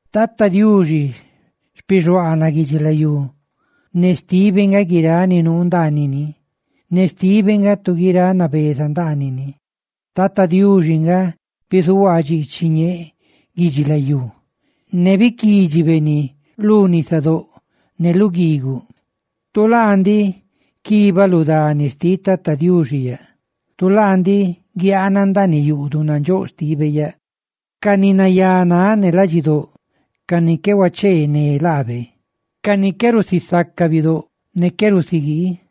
Tata Diuxi nga xpixuaanaꞌ guidubi guidxilayú, ne xtibe nga guiráꞌ ni nuu ndaanini, ne xtibe nga tu guiráꞌ nabeza ndaanini. Tata Diuxi nga bizuhuaa dxiichiꞌ ñee guidxilayú, ne biquídxibe ni lu nisadóꞌ ne lu guiiguꞌ. Tu laa ndiꞌ quibaꞌ lu dani xtiꞌ Tata Diuxi yaꞌ. Tu laa ndiꞌ guiaana ndaaniꞌ yuꞌduꞌ nandxóꞌ xtibe yaꞌ. Ca ni nayá náꞌ ne ladxidóꞌ, ca ni qué huacheené laabe, ca ni qué rusisacaꞌ bidóꞌ, ne qué rusiguii.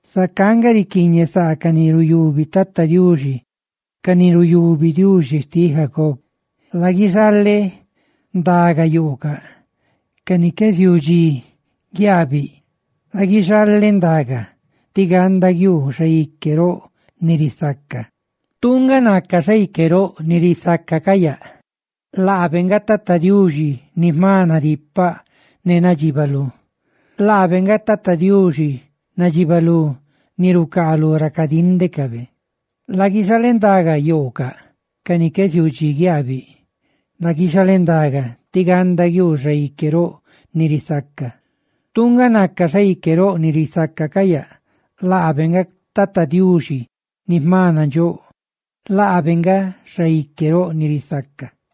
Zacá nga riquiiñe sáꞌ ca ni ruyubi Tata Diuxi, ca ni ruyubi Diuxi xtiꞌ Jacob. ¡Laguixaleꞌ ndagayoocaꞌ ca ni qué ziuu dxi guiaabiꞌ! ¡Laguixalendaga, tí ganda guiuu Xaique roꞌ ni risaca! Tu nga naca Xaique roꞌ ni risaca ca yaꞌ. ¡Laabe nga Tata Diuxi, ni jma nadipaꞌ ne nadxibalú! ¡Laabe nga Tata Diuxi, nadxibalú ni rucaalú ra cadíndecabe! ¡Laguixaleꞌ ndagayoocaꞌ ca ni qué ziuu dxi guiaabiꞌ! ¡Laguixalendaga, tí ganda guiuu Xaique roꞌ ni risaca! Tu nga naca Xaique roꞌ ni risaca ca yaꞌ. ¡Laabe nga Tata Diuxi ni jma nandxóꞌ! ¡Laabe nga Xaique roꞌ ni risaca!